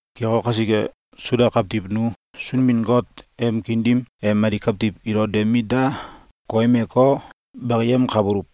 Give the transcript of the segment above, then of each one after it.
Keko kasike, Suda kawtiw nu Sunbin-Got em kiin dim e mali kawtiw ilo de mit da koyemeko, bakiyemkabuluw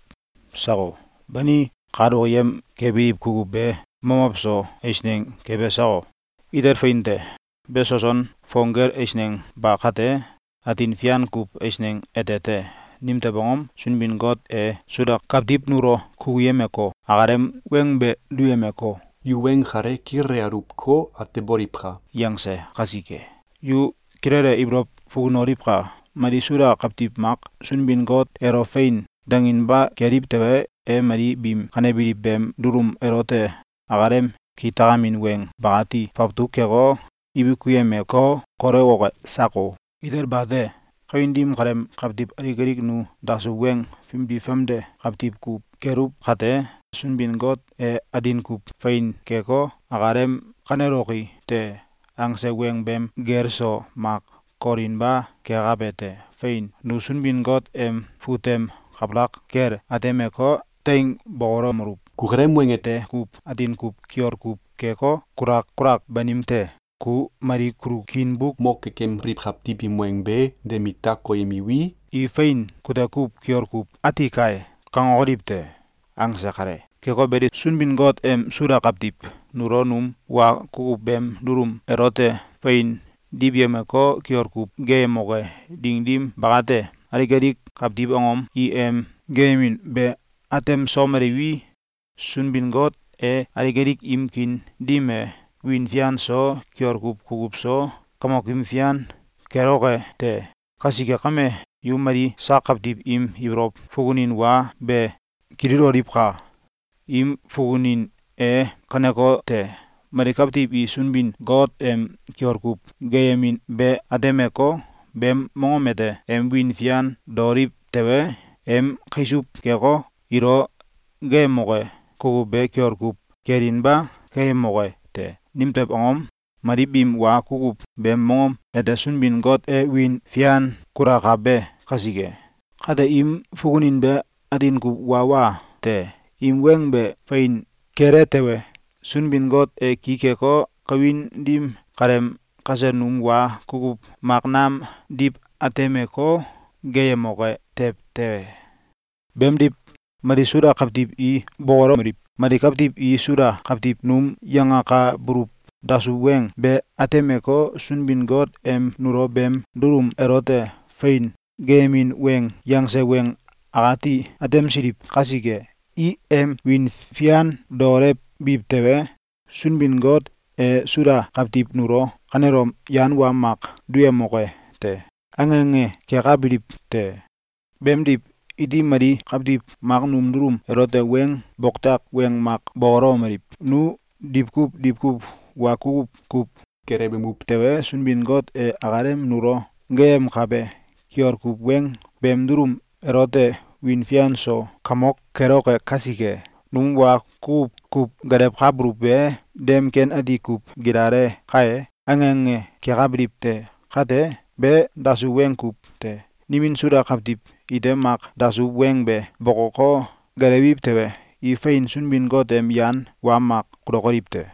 sako? Bani, kal okiyem kebiliw kukuw be mamow so eisneng kebe sako? Itel fein te! Be soson fong gel eisneng ba kate, atin fian kuw eisneng ete te! Nimtew angom? Sunbin-Got e Suda kawtiw nulo kukuyemeko, akalem weng be duyemeko, “Yu weng kale kilele aluwko, ateboliwka!”, yangse kasike. Yu kilele ibolow fukunoliwka! Mali Suda kawtiw mak Sunbin-Got elo “Fein!”, danginba keliw tewe, e mali biim kanebiliw beem dulum elote akalem kitakamin weng bakati fawtuk keko, ibikuyemeko, kolewoke sako? Itel bate! Kawin dim kaleem kawtiw alik alik nu dasuw weng fimdi famde kawtiw kuw keluw kate, Sunbin-Got e atin kuw fein keko, akalem “Kaneloki te!”, angse weng beem gel so mak kolinba kekabe te. Fein! Nu Sunbin-Got em fut tem kabalak kel atemeko, teing bokolomeluw: “Kukalem weng ete kuw atin kuw kiol kuw keko, kulak kulak banim te. Ku mali kulo kiin buk mo kekembiliw kawtiw im weng be de mit da koyemewi, i ‘Fein! Kute kuw kiol kuw ati kai!’, kangokoliw te.”, angse kale. Keko beli, Sunbin-Got em Suda kawtiw nulo num wa kukuw beem dulum elote fein diwyemeko, kiol kuw geeyemoke ding dim bakate, alik alik kawtiw angom i em geeyemin be atemsomeliwi, Sunbin-Got e alik alik im kiin dim e wiin fian so, kiol kuw kukuw so, Kamokim Fian keloke te. Kasike kame, yu mali sak kawtiw im ibolow fukunin wa be kililoliwka! Im fukunin e kanekote: Mali kawtiw i Sunbin-Got em kiol kuw geeyemin be atemeko, beem mongom ete em wiin fian daoliw tewe, em kaisuw keko, ilo geeyemoke kukuw be kiol kuw kelinba keyemoke te! Nimtew angom? Mali biim wa kukuw beem mongom ete Sunbin-Got e wiin fian kulakabe kasike. Kate im fukunin be atin kuw wa wa te! Im weng be fein kele tewe, Sunbin-Got e ki keko, kawin dim kaleem kasel num wa kukuw mak nam diw atemeko, geeyemoke tew te! Beemdiw, mali Suda kawtiw i bokolomeliw: “Mali kawtiw i Suda kawtiw num yangakabuluw dasuw weng be atemeko, Sunbin-Got em nulo beem dulum elote fein geeyemin weng yangse weng akati atemsiliw kasike, i em wiin fian daolewbiw tewe, Sunbin-Got e Suda kawtiw nulo kanelom yan wa mak duyemoke te!”, ange ange kekabiliw te. Beemdiw, iti mali kawtiw mak num dulum elote weng boktak weng mak bokolomeliw: “Nu diwkuw diwkuw wa kukuw kuw gelewemuw tewe, Sunbin-Got e akalem nulo geeyemkabe kiol kuw weng beem dulum elote wiin fian so Kamok keloke kasike, num wa kukuw kuw gelewkabuluw be dem ken ati kuw gilale kae!”, ange ange kekabiliw te. Kate, be dasuw weng kuw te! Nimin Suda kawtiw ite mak dasuw weng be bokoko, gelewemiw tewe, i fein Sunbin-Got em yan wa mak kulukoliw te.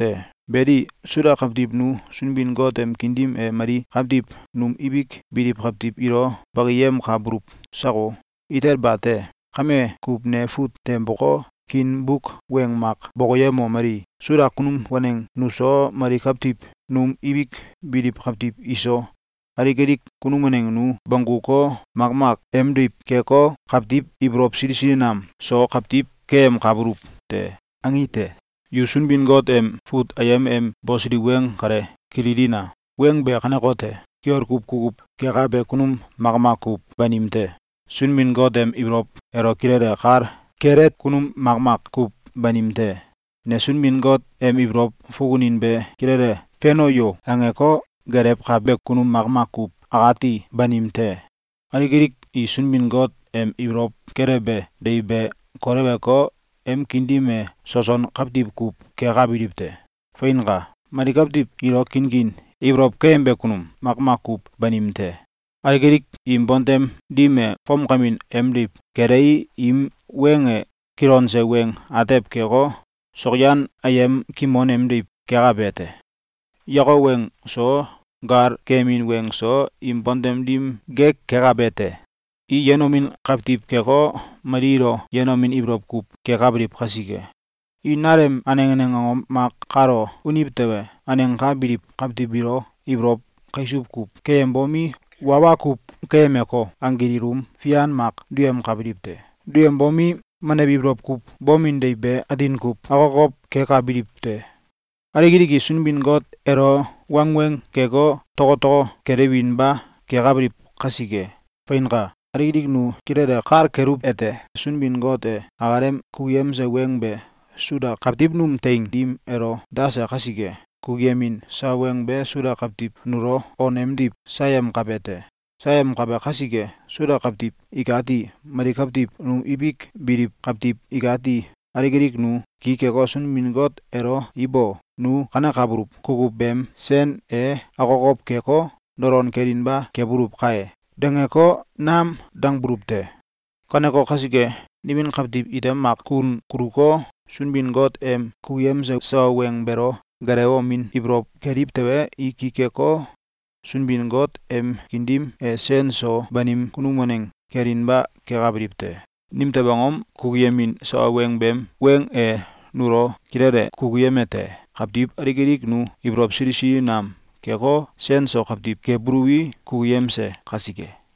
Beli, Suda kawtiw nu Sunbin-Got em kiin dim e mali kawtiw num ibik biliw kawtiw ilo bakiyemkabuluw sako? Itel bate! Kame kuw ne fut tem boko, kiin buk weng mak bokoyemomeli: “Suda kunum waneng nuso, mali kawtiw num ibik biliw kawtiw iso, alik alik kunum waneng nu bongguko, makmak emdiw keko, kawtiw ibolow sili sili nam so kawtiw keyemkabuluw te.”, angi te. Yu Sunbin-Got em fut ayem em bosiliw weng kale kililina! Weng be kanekote: “Kiol kuw kukuw kekabe kunum makmak kuw banim te. Sunbin-Got em ibolow elo kilele kal kele kunum makmak kuw banim te. ‘Ne Sunbin-Got em ibolow fukunin be kilele feno yo!’, angeko gelewkabe kunum makmak kuw akati banim te. Alik alik i Sunbin-Got em ibolow kelewbe deiw be koleweko, em kiin dim e soson kawtiw kuw kekabiliw te. Feinka! Mali kawtiw ilo kinkin ibolow keyembe kunum makmak kuw banim te. Alik alik im bontem dim e fomkamin emdiw kelei, im weng e kilonse weng atew keko, sokyan ayem kimon emdiw kekabe te. Yakok weng so, gal keyemin weng so, im bontem dim gek kekabe te. I yenomin kawtiw keko, mali ilo yenomin ibolow kuw kekabiliw kasike, i nalem aneng aneng angom mak kalo uniw tewe, aneng ka biliw kawtiw biilo ibolow kaisuw kuw keyembomi, wa wa kuw keyemeko, anggil ilum fian mak duyemkabiliw te. Duyembomi, menew ibolow kuw bomin deiw be atin kuw akokow kekabiliw te. Alik alik i Sunbin-Got elo wangweng keko, tokotoko kelewinba kekabiliw kasike!”, Feinka! Alik alik nu kilele kal keluwete: Sunbin-Got e akalem kukuyemse weng be Suda kawtiw num teing dim elo dase kasike, kukuyemin sawa weng be Suda kawtiw nulo on emdiw sayemkabe te. Sayemkabe kasike, Suda kawtiw ikati, mali kawtiw num ibik biliw kawtiw ikati, alik alik nu ki keko, Sunbin-Got elo “Ibo! Nu kanekabuluw kukuw beem sen e akokow keko, dolon kelinba kebuluw kai!”, dangeko, nam dangbuluw te. Kaneko kasike, nimin kawtiw ite mak kun kuluko, Sunbin-Got em kukuyemse sawa weng beelo gelewemomin ibolow keliw tewe, i ki keko, Sunbin-Got em kiin dim e sen so banim kunum waneng kelinba kekabiliw te. Nimtew angom? Kukuyemin sawa beem weng e nulo kilele kukuyemete: Kawtiw alik alik nu ibolow sili sili nam keko, sen so kawtiw kebuluwi, kukuyemse kasike!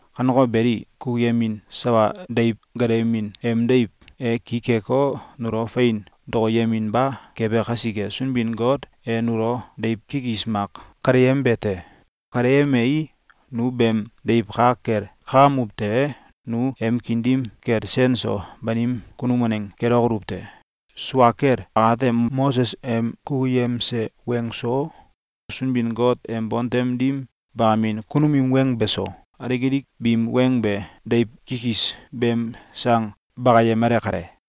Kaneko beli, kukuyemin sawa deiw gelewemin em deiw e ki keko, nulo fein dokoyeminba kebe kasike, Sunbin-Got e nulo deiw kikis mak kaleyembe te. Kaleyemei, nu beem deiw ka kel kakamuw tewe, nu em kiin dim kel sen so banim kunum waneng kelokoluw te. Sua kel akate, Moses em kukuyemse weng so, Sunbin-Got em bontem dim bakamin kunum im weng beso, alik alik biim weng be deiw kikis beem sang bakayemale kale.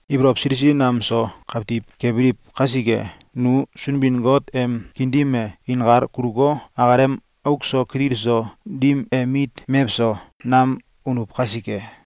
ibolow sili sili nam so kawtiw kebiliw kasike, nu Sunbin-Got em kiin dim e inkal kuluko, akalem auk so kitil so dim em mit mewso nam unuw kasike.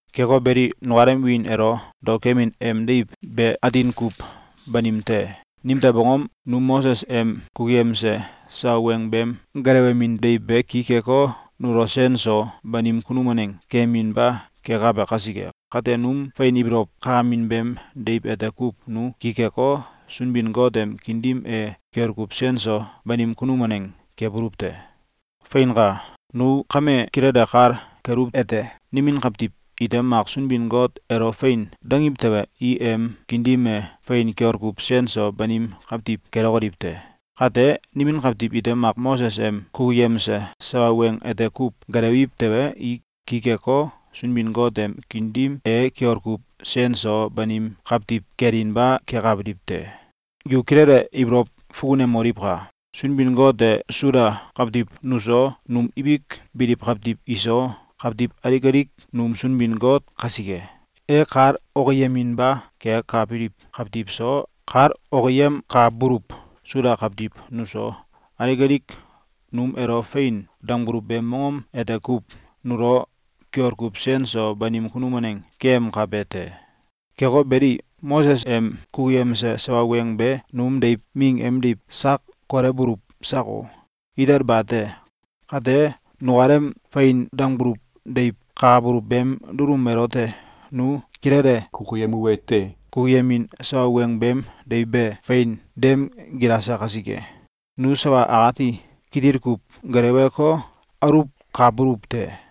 Keko beli, nukalem wiin elo daokemin em deiw be atin kuw banim te. Nimtew angom? Num Moses em kukuyemse sawa weng beem gelewemin deiw be ki keko, nulo sen so banim kunum waneng keyeminba kekabe kasike. Kate, num fein ibolow kakamin beem deiw ete kuw nu ki keko, Sunbin-Got em kiin dim e kiol kuw sen so banim kunum waneng kebuluw te. Feinka! Nu kame kilele kal keluwete: Nimin kawtiw ite mak Sunbin-Got elo “Fein!”, dangiw tewe, i em kiin dim e fein kiol kuw sen so banim kawtiw kelokoliw te. Kate, nimin kawtiw ite mak Moses em kukuyemse sawa weng ete kuw gelewiw tewe, i ki keko, Sunbin-Got em kiin dim e kiol kuw sen so banim kawtiw kelinba kekabiliw te. Yu kilele ibolow fukunemoliwka! Sunbin-Got e Suda kawtiw nuso, num ibik biliw kawtiw iso, kawtiw alik alik num Sunbin-Got kasike, e kal okiyeminba kekabiliw kawtiw so, kal okiyemkabuluw Suda kawtiw nuso, alik alik num elo “Fein!”, dangbuluw beem mongom ete kuw nulo kiol kuw sen so banim kunum waneng keyemkabe te. Keko beli, Moses em kukuyemse sawa weng be num deiw ming emdiw sak kolewbuluw sako? Itel bate! Kate nukalem fein dangbuluw deiw kakabuluw beem dulum elote nu kilele kukuyemuwete: Kukuyemin sawa weng beem deiw be fein dem gilase kasike, nu sawa akati kitil kuw geleweko, aluwkabuluw te.